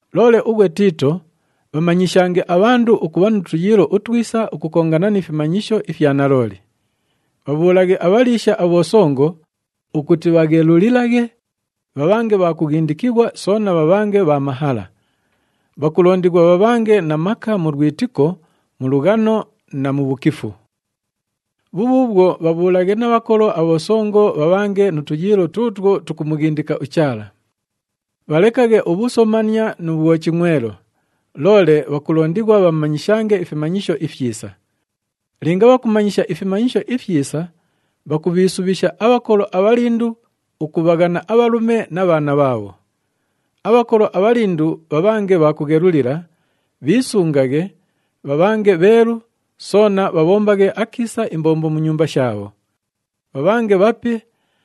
Loole ughwe Tiito, bhamanyishange abhandu ukubha nu tuyiilo utwisa ukukongana ni fimanyisho ifya nalooli. Bhabhuulaghe abhaliisha abhosongo ukuti bhaghelulilaghe, bhabhange bha kughindikighwa soona bhabhange bha mahala. Bhakulondighwa bhabhange na maka mu lwitiko, mu lughano na mu bhukifu. Bhubhuubhwo, bhabhuulaghe na bhakolo abhosongo bhabhange nu tuyiilo tuutwo tukumughindika uChaala. Bhalekaghe ubhusomania nu bhwochingʼwelo, loole bhakulondighwa bhamanyishange ifimanyisho ifyisa. Linga bhakumanyisha ifimanyisho ifyisa, bhakubhiisubhisha abhakolo abhalindu ukubhaghana abhalume na bhaana bhaabho. Abhakolo abhalindu bhabhange bha kughelulila, bhiisungaghe, bhabhange bheelu, soona bhabhombaghe akiisa imbombo mu nyumba shaabho. Bhabhange bhape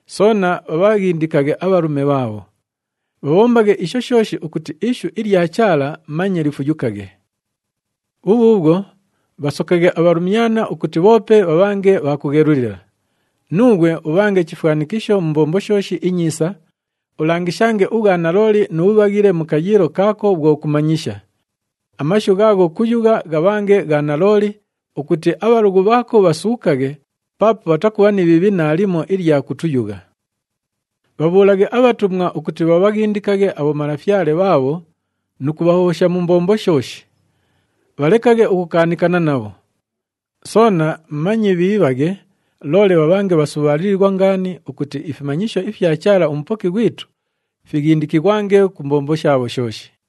soona bhabhaghindikaghe abhalume bhaabho. Bhabhombaghe isho shooshi ukuti ishu ilya Chaala manye lifuyukaghe. Bhubhuubhwo, bhasokaghe abhalumyana ukuti bhoope bhabhange bha kughelulila. Nuughwe ubhange chifwanikisho mu mbombo shooshi inyiisa, ulangishange ubhwanalooli nu bhubhaghile mu kayiilo kaako bhwo kumanyisha. Amashu ghaagho kuyugha ghabhange gha nalooli ukuti abhalughu bhaako bhasuukaghe paapo bhatakubha ni bhiibhi naalimo ilya kutuyugha. Bhabhuulaghe abhatumwa ukuti bhabhaghindikaghe abhomalafyale bhaabho nu kubhahobhosha mu mbombo shooshi. Bhalekaghe ukukaanikana nabho. Soona manye bhiibhaghe, loole bhabhange bhasubhaalilighwa ngaani ukuti ifimanyisho ifya Chaala uMupoki ghwitu fighindikighwange ku mbombo shaabho shooshi.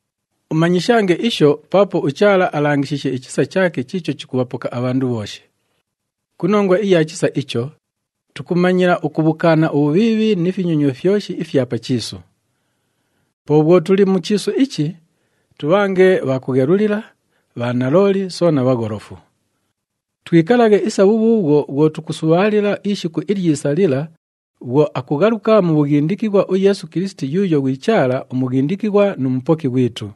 Umanyishange isho paapo uChaala alangishiishe ichisa chaake chiicho chikubhapoka abhandu bhooshi. Ku nongwa iya chisa icho, tukumanyila ukubhukaana ubhubhiibhi ni finyonywa fyoshi ifya pa chiisu. Po bhwo tuli mu chiisu ichi, tubhange bha kughelulila, bhanalooli soona bhagholofu. Twikalaghe isa bhubhuubhwo bhwo tukusubhaalila ishiku ilyisa lila bhwo akughaluka mu bhughindikighwa uYeesu Kilisiti yuuyo ghwi Chaala uMughindikighwa nu Mupoki ghwitu.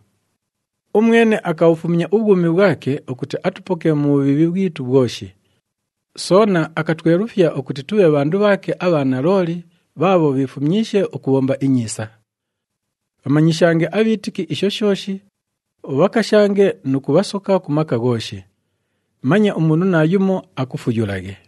Umwene akabhufumya ubhwumi bhwake ukuti atupoke mu bhubhiibhi bhwitu bhwoshi. Soona akatwelufya ukuti tubhe bhandu bhaake abha nalooli bhaabho bhiifumyishe ukubhomba inyiisa. Bhamanyishange abhiitiki isho shooshi, ubhakashange nu kubhasoka ku maka ghooshi. Manye umundu naayumo akufuyulaghe.